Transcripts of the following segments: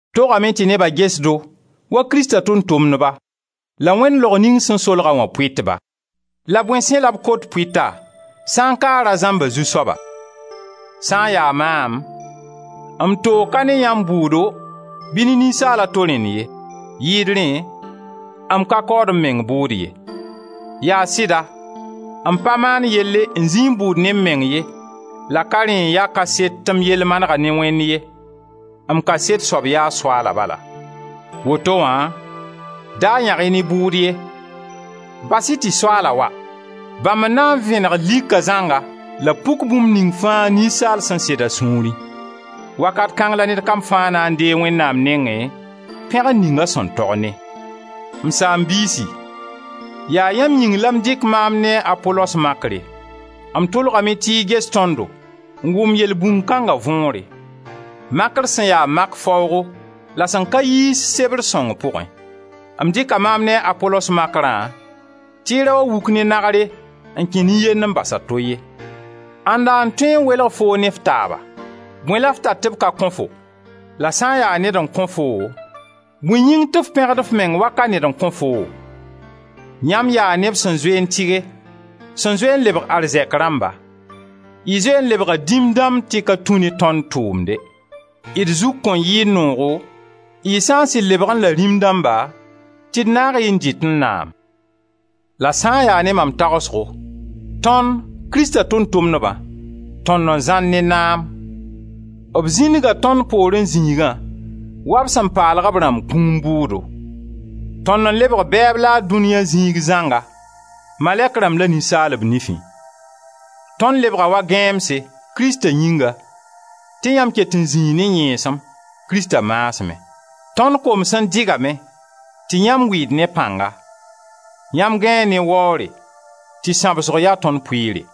Togame tɩ neba ges-do wa Krista tʋʋm-tʋmdba la Wẽnd laog ning sẽn solga wã pʋɩtba. La bõe sẽ la b kot pʋɩta sã ka a ra zãmb a zu-soaba. Sã n ya maam, m toog ka ne yãmb bʋʋdo bɩ ne ninsaal a to rẽnd ye; yɩɩd rẽ, m ka kaood m meng bʋʋd ye. Yaa sɩda, m pa maan yelle n zĩi n bʋʋd ne m meng ye la ka rẽ n ya kaset tɩ m yell manega ne Wẽnd ye. M kaset soab yaa Soaala bala. Woto wã, da yãg-y ne bʋʋd ye. Bas-y tɩ Soaala wa. Bãmb n na n vẽneg lika zãnga la b puk bũmb ning fãa ninsaal sẽn sed a sũurẽ. Wakat kãng la ned kam fãa na n deeg Wẽnnaam nengẽ, pẽgr ning a sẽn tog ne. M saam-biisi, yaa yãmb yĩng la m dɩk maam ne a Apolos makre; m tʋlgame tɩ y ges tõndo n wʋm yelbũnd kãnga võore: Makr sẽn ya mak faoogo la sẽn ka yiis Sebr sõng pʋgẽ. M dɩka maam ne a Apolos makrã tɩ y ra wa wuk ne nagre n kẽ nin-yend n bas a to ye. Ãnda n tõe n welg foo ne f taaba? Bõe la f tar tɩ b ka kõ-fo? La sã n ya ned n kõ foo, bõe yĩng tɩ f pẽgd f meng wa ka ned n kõ foo? Yãmb yaa neb sẽn zoe n tɩge, sẽn zoe n lebg arzɛk rãmba; y zoe n lebga dĩm dãmb tɩ ka tũ ne tõnd tʋʋmde. D zug kõn yɩẽ noogo y sã sɩd lebgẽ la rĩm dãmba, tɩ d naag-y n dɩtẽ naam? La sã n ya ne mam tagsgo, tõnd, Krista Tʋʋm-tʋmdbã, tõnd n zãr ne naam; b zĩndga tõnd poorẽ zĩigã, wa b sẽn paalg b rãmb kũum bʋʋdo; tõnd n lebg bɛɛb laad dũniya zĩig zãnga, malɛk rãmb la ninsaalb nifẽ. Tõnd lebga wa gãeemse, Krista yĩnga, tɩ yãmb ket n zĩ ne y yẽesem, Krista maasmẽ. Tõnd koms n dɩgame tɩ yãmb wɩɩd ne pãnga. Yãmb gãee ne waoore tɩ sãbsgo ya tõnd pʋɩɩre.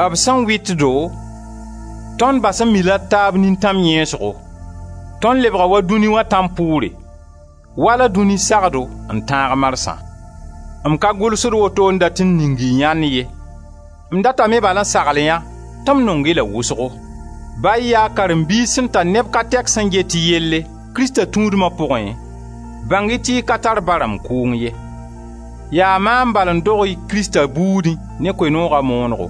b sẽn wɩt-do, tõnd bas n mi-la d taab nintãm yẽesgo. Tõnd lebga wa dũni wã tãmpʋʋre, wala dũni sagdo n tãag marsã. M ka gʋlsd woto n dat n ning y yãnd ye, m datame bal n sagl yã tɩ m nong-y la wʋsgo. Ba y ya karen-biis sẽn tar neb ka tɛk sẽn get y yelle, Krista tũudma pʋgẽ, bãng-y tɩ y ka tar ba rãmb kʋʋng ye. Yaa maam bal n dog-y Krista buudẽ ne Koe-nooga moonego.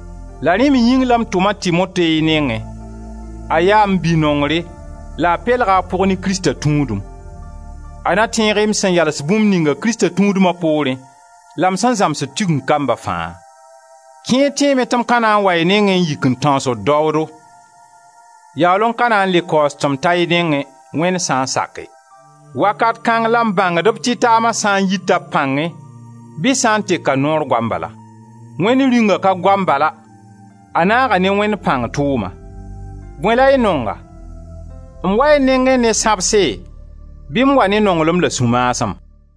La yaa rẽ me yĩng la m tʋm a Timote y nengẽ: a yaa m bi-nongre la a pelga a pʋg ne Krista tũudem. A na tẽeg-y m sẽn yals bũmb ninga Krista tũudma poorẽ, la m sẽn zãmsd Tigeng kamba fãa. Kẽer tẽeme tɩ m ka na n wa y nengẽ n yik n tãoosd daoodo. Yaool n ka na n le kaoos tɩ m ta y nengẽ, Wẽnd sã n sake. Wakat kãng la m bãngd b tɩtaama sã n yita b pãngẽ bɩ sã n teka noor goam bala. Wẽnd Rĩunga ka goam bala, a naaga ne Wẽnd pãng tʋʋma. Bõe la y nonga? M wa y nengẽ ne sãbse bɩ m wa ne nonglem la sũ-maasem?